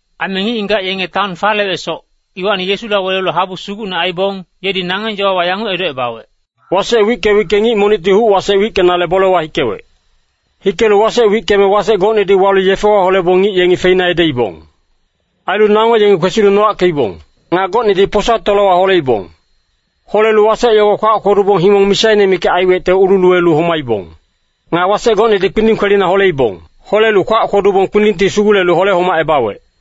Aime ngic-ngigac yenge taon falewecsoc, iwacni Yesula welelu habu sugucne aibong, yedi nangeng yowa yanguc edocebawec, “Wasec wicke-wicke ngic monicti huc-wasec wickenale bolewa hikewec. Hikelu wasec wickeme wasec gocnedi walu yefewa holebong ngic yengi feina edeibong. Ailu nango yengi kwesilu nowackeibong. Nga gocnedi posa tolowa holeibong. Holelu wasec yogo kwac kwodubong himong misaine mikac aiwecte ululuwelu homaibong. Nga wasec gocnedi kpinding kwelina holeibong. Holelu kwac kwodubong kpindingti sugulelu hole-homacebawec.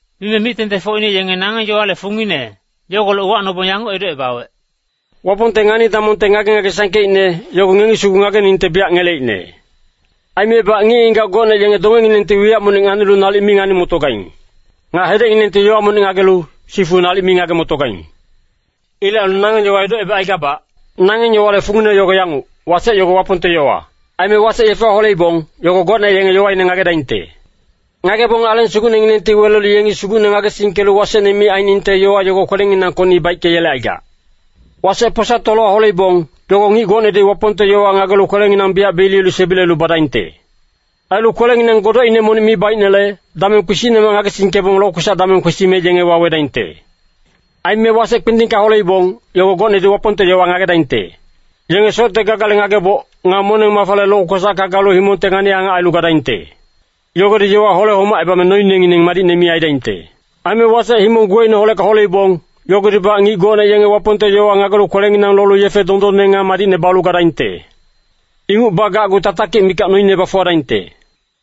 Mime mic-tengtengfocine yenge nangeng yowale fungine yogolec uwacnobong yanguc edocebawec, “Wapongte ngani-damongte ngage-ngage sangkeicne, yogo ngengi sugu ngageningte biyac ngeleicne. ‘Aimebac ngic-ngigac gocne yenge dongenginengti wiyac monic nganilu nalic mi ngani-motogaing. Nga hedecnginengti yowa monic ngagelu, sifu nalic mi ngage-motogaing.’ Ilec ailu nangeng yowa edocebacaigabac. “Nangeng yowale fungine yogo yanguc, wasec yogo Wapongte yowa. Aime wasec yefewa holeibong, yogo gocne yenge yowaine ngagedaingte. Ngagebong Aleng Sugucnenginengti welelu yengi Sugucne ngagesingkelu wasecne mi ainingte yowa yogo kwelenginangkocni baickeyelecaigac. Wasec posa tolowa holeibong, yogo ngic gocnedi Wapongte yowa ngagelu kwelenginang biyac beliyelu sebilelu badaingte. Ailu kwelenginang godocine monic mi baicnele, dameng kpisicnemac ngagesingkebong lokwesac dameng kwesime yenge wawedaingte. Aime wasec kpindingka holeibong, yogo gocnedi Wapongte yowa ngagedaingte. Yenge socte gagale ngageboc, nga moneng-mafale lokwesacka galu himongte ngani-angac ailu gadaingte. Yogodi yowa hole-homacebame noinengineng madicne mi aidaingte. Aime wasec himong guwecineholecka holeibong, yogodibac ngic gocne yenge Wapongte yowa ngagelu kwelenginang lolu yefe dondonne nga madicne balu gadaingte. Inguc bagacgu tatakic mikac noine bafuwadaingte.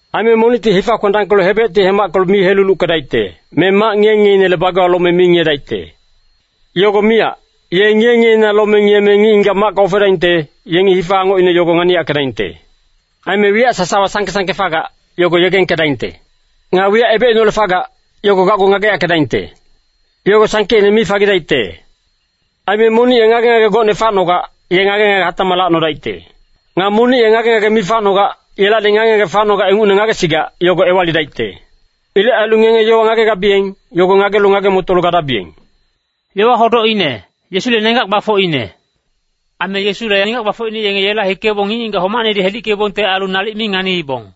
“Aime monicti hifa kwendangkelu hebecti hemackelu mi heluluckedaicte, me mac ngiye-ngiyeinele bagewa lome mi ngiyedaicte. Yogo miyac, ye ngiye-ngiyeina lome ngiyeme ngic-ngigac macka ofedaingte, yenge hifa angocine yogo nganiyackedaingte. Aime wiyac sasawa sangke-sangke fagac, yogo yegengkedaingte. Nga wiyac ebecineholec fagac, yogo gacgu ngageyackedaingte. Yogo sangkeicne mi fagidaicte. Aime monic ye ngage-ngage gocne facnogac, ye ngage-ngage hatacmac lacnodaicte. Nga monic ye ngage-ngage mi facnogac, yelacni ngage-ngage facnogac ingucne ngagesigac, yogo ewalidaicte. Ilec ailu ngenge yowa ngagegabiyeng, yogo ngagelu ngage-motolu gadabiyeng.” Aime Yesule nenggac gbafocine yenge yela hikebong, ngic-ngigac homacnedi hedickeibongte ailu nalic mi nganiibong.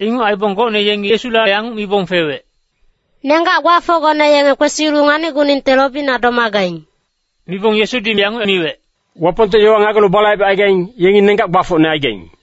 Inguc aibong gocne yengi Yesula yanguc mibong fewec, “Nenggac gbafocgone yenge kwesilu nganicguningte lobina domagaing.” Mibong Yesudi yanguc miwec, “Wapongte yowa ngagelu balaibecaigaing, yengi nenggac gbafocne aigaing.”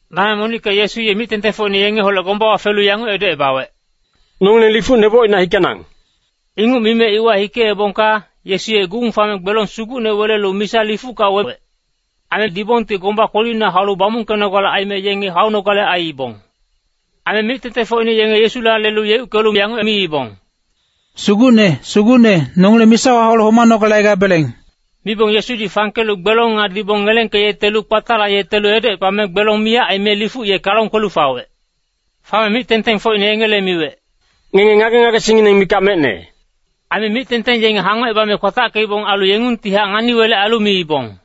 Dameng monicka Yesu ye mic-tengtengfocine yengeholec gombawa felu yanguc edocebawec, “Nongileng lifuc nebocina hikenang.” Inguc mime iwa hikeebongka, Yesu ye gung fame gbelong sugucne welelu misa lifucka wewec. Aime dibongti gomba kwelina haulu bamungkenogale aime yenge haunogale aiibong. Aime mic-tengtengfocine yenge Yesula lelu yeuckelu yanguc miibong, “Sugucne, Sugucne, nongileng misawa haulu homanogale aigabeleng!” Mibong Yesudi fangkelu gbelong nga dibong ngelengkelu kpatalayetelu edocepame, gbelong miyac aime lifuc ye kalong kwelu fawec. Fame mic-tengtengfocine yengele miwec, “Ngenge ngage-ngagesingngineng mikac mecne.” Aime mic-tengteng yenge hangocebame kwatackeibong. Ailu yengungtihac ngani-welec ailu miibong,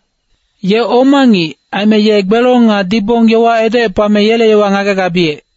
“Ye oma ngic, aime ye gbelong nga dibong yowa edocepame yele yowa ngagegabiyec.”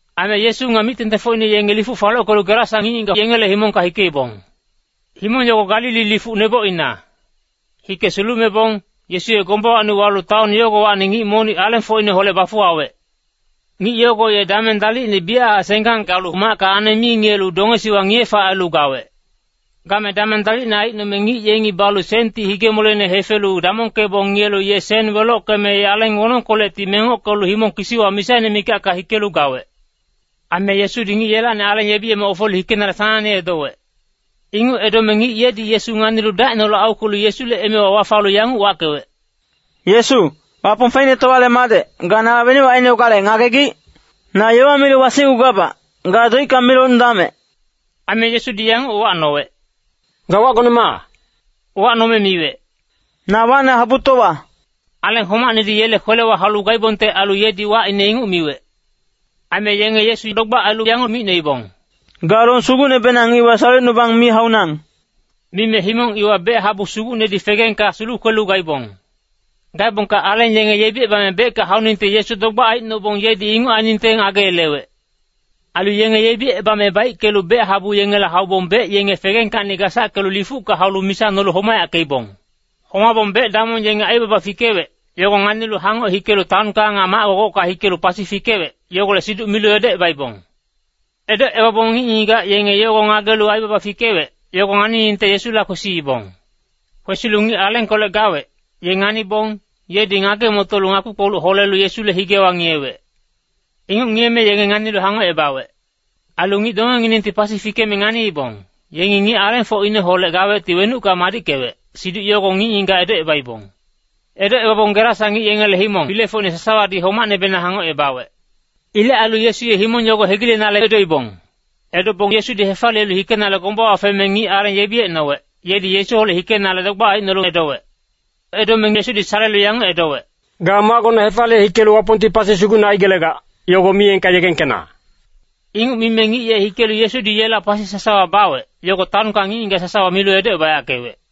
Aime Yesu nga mic-tengtengfocine yenge lifuc falockelu Gerasa ngic-ngigac yengele himongka hikeibong. Himong yogo Galili lifuc nebocina. Hike sulumebong, Yesu ye gombawacni walu taon yogowacni ngic monic alengfocineholec bafuwawec. Ngic yogo ye dameng dalicne biyachac senggang galu macka aneng mi ngiyelu dongesiwa ngiye-fac ailu gawec. Game dameng dalicne aicnome ngic yengi balu senti hige-moleine hefelu damongkebong ngiyelu, ye sen welockeme aleng wonongkolecti mengockelu himong kisiwa misaine mikacka hikelu gawec. Aime Yesudi ngic yelacni aleng yebiyeme ofelu hikenale sanangne edowec. Inguc edome ngic yedi Yesu nganilu dacineholec aukwelu Yesule emewa wafalu yanguc wackewec, “Yesu, Wapong Feicnetowale Madec, ga nala wenuc ainogale ngagegic? Na yowa milu wasicgugabac, ga doicka mi locnudamec!” Aime Yesudi yanguc uwacnowec, “Ga wacgone ma?” Uwacnome miwec, “Na wacne Habutowa.” Aleng homacnedi yele kwelewa haulu gaibongte ailu yedi wacine inguc miwec. Aime yenge Yesu dogbac ailu yanguc micnoibong, “Ga long sugucnebenang iwa salecnubang mi haunang!” Mime himong iwa bec-habu sugucnedi fegengka sulukwelu gaibong. Gaebongka aleng yenge yebicebame becka hauningte Yesu dogbac aicnobong, yedi inguc ainingte ngageyelewec. Ailu yenge yebicebame baickelu bec-habu yengela haubong bec yenge fegengkacni gasackelu lifucka haulu misa nolu homayackeibong. Homabong bec-damong yenge aibaba fikewec, yogo nganilu hangoc hikelu taonka nga mac-gogocka hikelu pasi fikewec, yogolec siduc milu edocebaibong. Edocebabong ngic-ngigac yenge yogo ngagelu aibaba fikewec, yogo nganiningte Yesula kwesiibong. Kwesilu ngic alengkolec gawec, ye nganibong, yedi ngage-motolu ngakpi-kpoluc holelu Yesule higewa ngiyewec. Inguc ngiyeme yenge nganilu hangocebawec. Ailu ngic dongenginengti pasi fikeme nganiibong, yengi ngic alengfocineholec gawecti wenucka madickewec, siduc yogo ngic-ngigac edocebaibong. Edocebabong Gerasa ngic-ngigac yengele himong filefocine sasawadi homacnebenang hangocebawec. Ilec ailu Yesu ye himong yogo hegilenale edoibong. Edobong Yesudi hefaliyelu hikenale gombawa feme ngic aleng yebiyecnowec, yedi Yesuholec hikenale dogbac aicnolu edowec. Edome Yesudi salelu yanguc edowec, “Ga macgona hefaliye hikelu Wapongti pasi sugucne aigelegac, yogo miyengka yegengkena.” Inguc mime ngic ye hikelu Yesudi yela pasi sasawa bawec, yogo taonka ngic-ngigac sasawa milu edocebayackewec.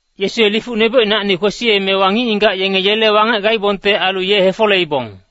Yesu ye lifuc nebocinacni kwesiyemewa, ngic-ngigac yenge yele wangec gaibongte ailu ye hefoleibong.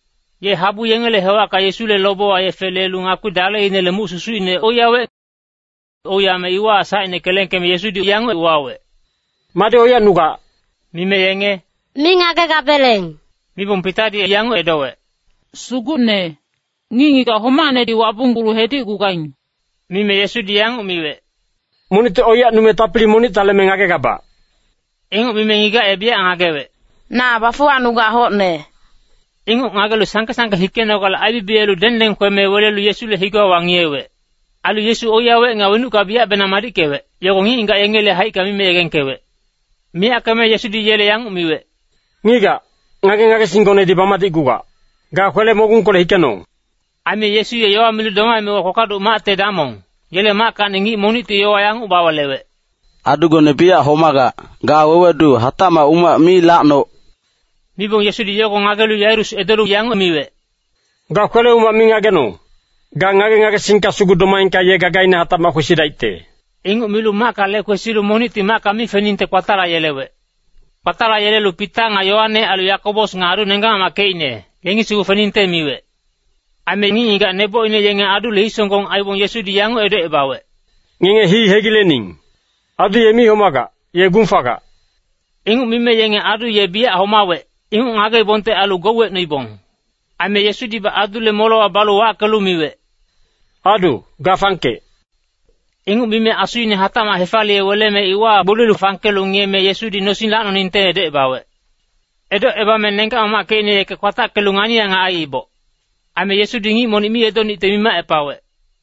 Ye habu yengele hewacka Yesule lobewa yefe lelu ngakpi daleinele muc susucine oiyawec. Oiyame iwahac sacine kelengkeme Yesudi yanguc uwawec, “Madi oiyacnugac?” Mime yenge “mi ngagegabeleng” mibong Pitadi yanguc edowec, “Sugucne, ngic-ngigac homacnedi wabunggulu hedicgugaing!” Mime Yesudi yanguc miwec, “Monicti oiyacnume tapili monicta leme ngagegabac.” Inguc mime ngigac ye biyac ngagewec, “Na bafuwacnugac hocne.” Inguc ngagelu sangke-sangke hikenogale aibibiyelu dengdengkeme welelu Yesule higewa wangiyewec. Ailu Yesu oiyawec, nga wenucka biyacbenang madickewec, yogo ngic-ngigac yengele haicka mime yegengkewec. Miyackeme Yesudi yele yanguc miwec, “Ngigac, ngage-ngagesinggonedi bamadicgugac. Ga kwele-mogungkolec hikenong!” Aime Yesu ye yowa milu domaemewa kpakpaduc macte damong, yele mackacni ngic monicti yowa yanguc bawelewec, “Adugone biyac homagac, ga wewedu hatacmac umac mi lacnoc!” Mibong Yesudi yogo ngagelu Yairus edolu yanguc miwec, “Ga kwele-umac mi ngagenong! Ga ngage-ngagesingka sugu domaengka ye gagaine hatacmac kwesidaicte.” Inguc milu macka lekwesilu monicti macka mi feningte kpatalayelewec. Kpatalayelelu Pita nga Yoane ailu Yakobos nga adu nenggac-mamackecine, yengi sugu feningte miwec. Aime ngic-ngigac nebocine yenge adule hisonggong aibong Yesudi yanguc edocebawec, “Ngenge hii hegilening. Adu ye mi homagac, ye gung fagac.” Inguc mime yenge adu ye biyac homawec, inguc ngageibongte ailu gouwecnoibong. Aime Yesudibac adule molewa balu wackelu miwec, “Adu, ga fangkec!” Inguc mime asuine hatacmac hefaliye weleme iwahac gboliyelu fangkelu ngiyeme, Yesudi nosing lacnoningte edocebawec. Edocebame nenggac-mamackecine yeke kwatackelu ngani-angac aiiboc. Aime Yesudi ngic monic mi edonicte mimacepawec.